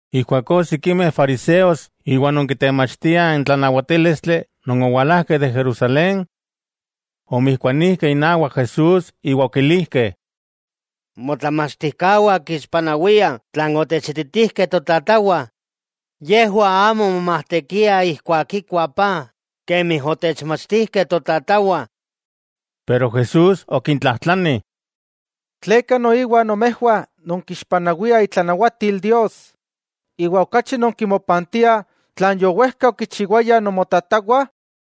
Ijkuakó sikimeh fariseos iwa non kitemachtiah n tlanawatílistli non owalajkeh de Jerusalén, omijkuanijkeh inawak Jesús iwa okilijkeh: —Motlamachtijkawah kixpanawiah tlan otechititijkeh totatawah. Yejwah amo momajtekiah ijkuak kikuah paj kemi otechmachtijkeh totatawah. Pero Jesús okintlajtlani: —¿Tleka noiwa nomejwah nonkixpanawiah itlanawatil Dios, iwa okachi nonkimopantiah tlan yowejka okichiwayah nomotatawah?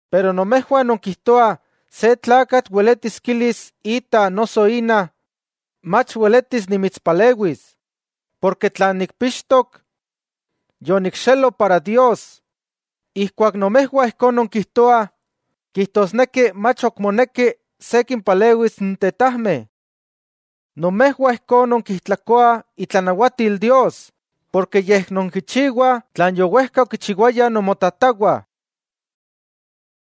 Pero nomejwah nonkijtoah se tlakatl weletis kilis ita noso ina: “Mach weletis nimitspalewis, porke tlan nikpixtok, yonikxelo para Dios.” Ijkuak nomejwah ijkó nonkijtoah, kijtosneki mach ok moneki se kimpalewis n tetajmeh. Nomejwah ijkó nonkijtlakoah itlanawatil Dios porke nonkichiwah tlan yowejka okichiwayah nomotatawah.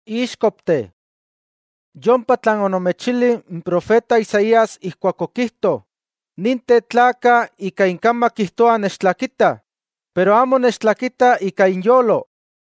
¡Íxkopteh! Yompa tlan onomechilih n profeta Isaías ijkuak okijto: Ninteh tlakah ika inkamak kijtoah nechtlakitah, pero amo nechtlakitah ika inyolo.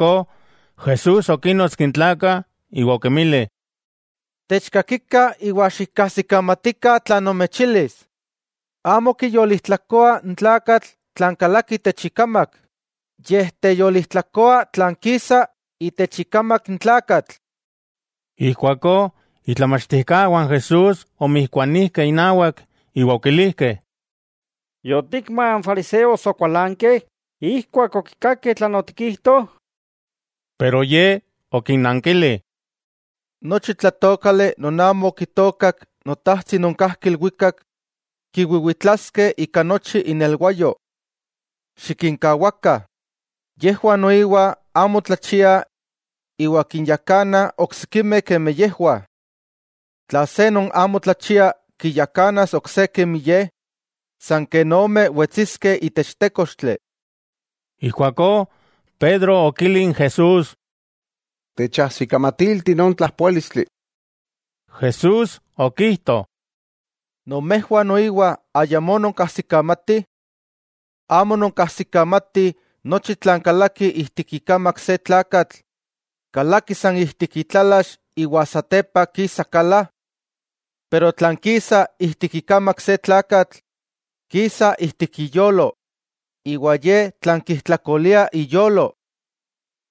Ijkuakó Jesús okínnotski n tlakah iwa okinmili: —Techkakikah iwa xikkajsikamatikah tlan nomechilis: Amo kiyolijtlakoa n tlakatl tlan kalaki itech ikamak, yej teyolijtlakoa tlan kisa itech ikamak n tlakatl. Ijkuakó itlamachtijkawah n Jesús omijkuanijkeh inawak iwa okilijkeh: —¿Yotikma n fariseos okualankeh ijkuak okikakeh tlan otikijto? Pero Ye okinnankili: —Nochi tlatookali non amo okitookak Notajtsi non kajki ilwikak, kiwiwitlaskeh ika nochi inelwayo. Xikinkawakah, yejwah noiwa amo tlachiah iwa kinyakanah oksikimeh kemi yejwah. Tla se non amo tlachia kiyakanas ok se kemi ye, san ken ome wetsiskeh itech tékochtli. Ijkuakó Pedro okili n Jesús: —Techajsikamatilti non tlapoálistli. Jesús okijto: —¿Nomejwah noiwa ayamó nonkajsikamatih? ¿Amo nonkajsikamatih nochi tlan kalaki ijtik ikamak se tlakatl, kalaki san ijtik itlalax, iwa satepa kisa kala? Pero tlan kisa ijtik ikamak se tlakatl, kisa ijtik iyolo, iwa ye tlan kijtlakolia iyolo.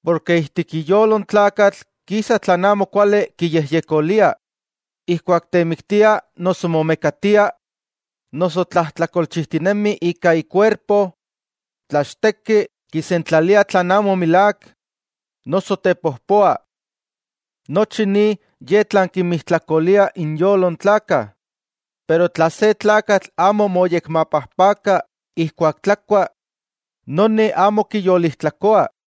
Porke ijtik iyolo n tlakatl kisa tlan amo kuali kiyejyekolia, ijkuak temiktia, noso momekatia, noso tlajtlakolchijtinemi ika ikuerpo, tlachteki, kisentlalia tlan amo milák, noso tepojpoa. Nochi ni ye tlan kinmijtlakolia inyolo n tlakah, pero tla se tlakatl amo moyekmapajpaka ijkuak tlakua, noni amo kiyolijtlakoa.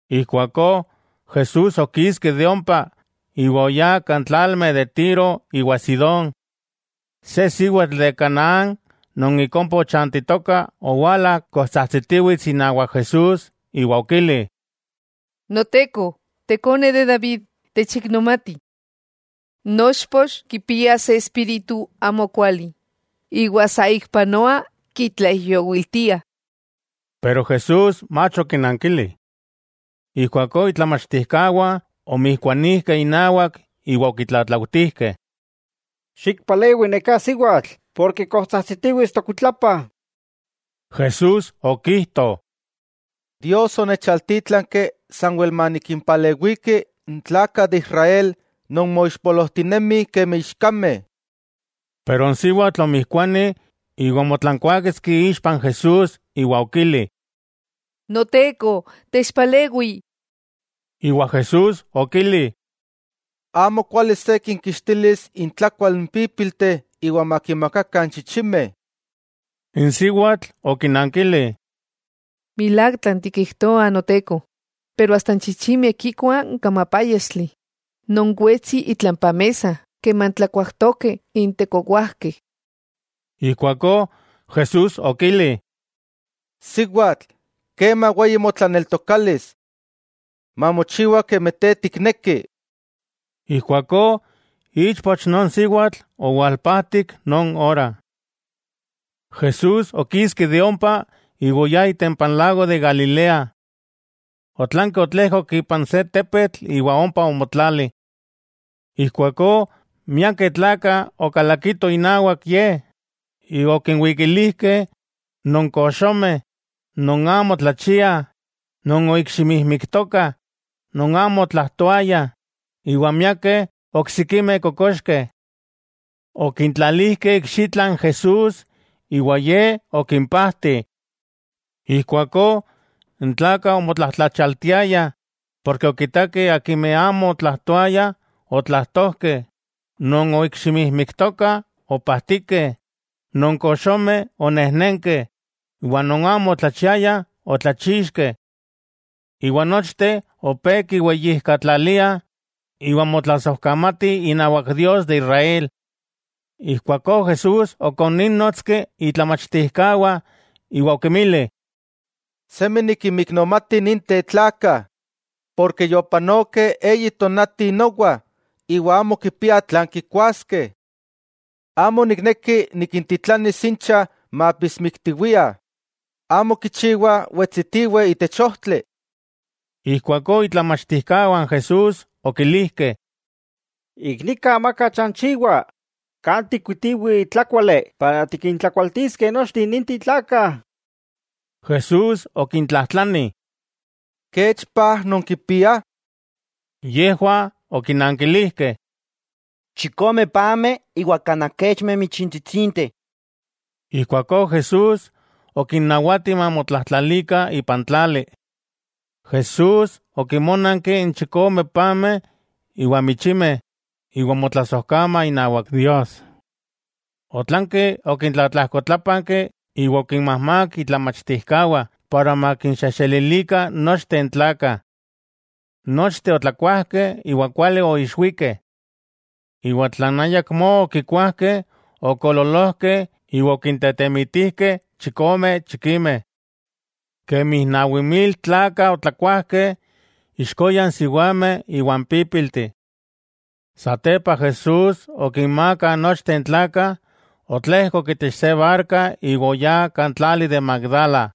Ijkuakó Jesús okiski de ompa, iwa oyá kan tlalmeh de Tiro iwa Sidón. Se siwatl de Canaán non ik ompa ochantitoka owala kojtsajtsitiwits inawak Jesús iwa okili: —¡Noteko, tekone de David, techiknomati! Nochpoch kipia se espíritu amokuali iwa sa ik panoa kitlaijyowiltia. Jesús mach okinankili. Ijkuakó itlamachtijkawah omijkuanijkeh inawak iwa okitlatlautijkeh: —Xikpalewi neká siwatl porke kojtsajtsitiwits tokuitlapah. Jesús okijto: —Dios onechaltítlanki sanwel manikimpalewiki n tlakah de Israel non moixpolojtinemih kemi ichkameh. Pero n siwatl omijkuani iwa omotlankuaketski ixpa n Jesús iwa okili: —¡Noteko, techpalewi! Iwa Jesús okili: —Amo kuali se kinkixtilis intlakual n pípilteh iwa makinmakakah n chichimeh. N siwatl okinankili: —Milák tlan tikijtoa Noteko, asta n chichimeh kikuah n kamapáyaxtli non wetsi itlampa mesa keman tlakuajtokeh intekowajkeh. Ijkuakó Jesús okili: —¡Siwatl, kema weyi motlaneltokalis! Mamochiwa kemi te tikneki. Ijkuakó, ichpoch non siwatl owalpajtik non ora. Jesús okiski de ompa iwa oyá itempa n lago de Galilea. Otlanki otlejkok ipan se tepetl iwa ompa omotlali. Ijkuakó, miakeh tlakah okalakitoh inawak Ye, iwa okinwikilijkeh non koxomeh, non amo tlachiah, non oikximijmiktokah, non amo otlajtoayah, iwa miakeh oksikimeh kokoxkeh. Okintlalijkeh ikxitla n Jesús, iwa Ye okimpajti. Ijkuakó n tlakah omotlajtlachialtiayah ken okitakeh akimeh amo otlajtoayah otlajtojkeh, non oikximijmiktokah opajtikeh, non koxomeh onejnenkeh iwa non amo otlachiayah otlachixkeh. Iwa nochteh opé kiweyijkatlaliah iwa motlasojkamatih inawak Dios de Israel. Ijkuakó Jesús okonínnotski itlamachtijkawah iwa okinmili: —Semi nikinmiknomati ninteh tlakah, porke yopanokeh eyi tonati nowa iwa amo kipiah tlan kikuaskeh. Amo nikneki nikintitlanis incha maapismiktiwiah, amo kichiwa wetsitiweh itech ojtli. Ijkuakó itlamachtijkawah n Jesús okilijkeh: —Ik nika amaka chanchiwa. ¿Kan tikkuitiweh tlákuali para tikintlakualtiskeh nochteh ninteh tlakah? Jesús okintlajtlani: —¿Kech paj nonkipiah? Yejwah okinankilijkeh: —Chikomeh pameh iwa kanaj kechmeh michintsitsinteh. Ijkuakó Jesús okinnawati mamotlajtlalikah ipan tlali. Jesús okinmónanki n chikome pameh iwa n michimeh iwa omotlasojkama inawak Dios. Otlanki okintlatlajkotlapanki iwa okinmajmák itlamachtijkawah makinxejxelilikah nochteh n tlakah. Nochteh otlakuajkeh iwa kuali oixwikeh. Iwa tlan ayakmó okikuajkeh okoololojkeh iwa okintetemitijkeh chikome chikimeh. Kemi nawi mil tlakah otlakuajkeh, ixkoya n siwameh iwa n pípilteh. Satepa Jesús okinmaaka nochteh n tlakah, otlejkok itech se barka iwa oyá kan tlali de Magdala.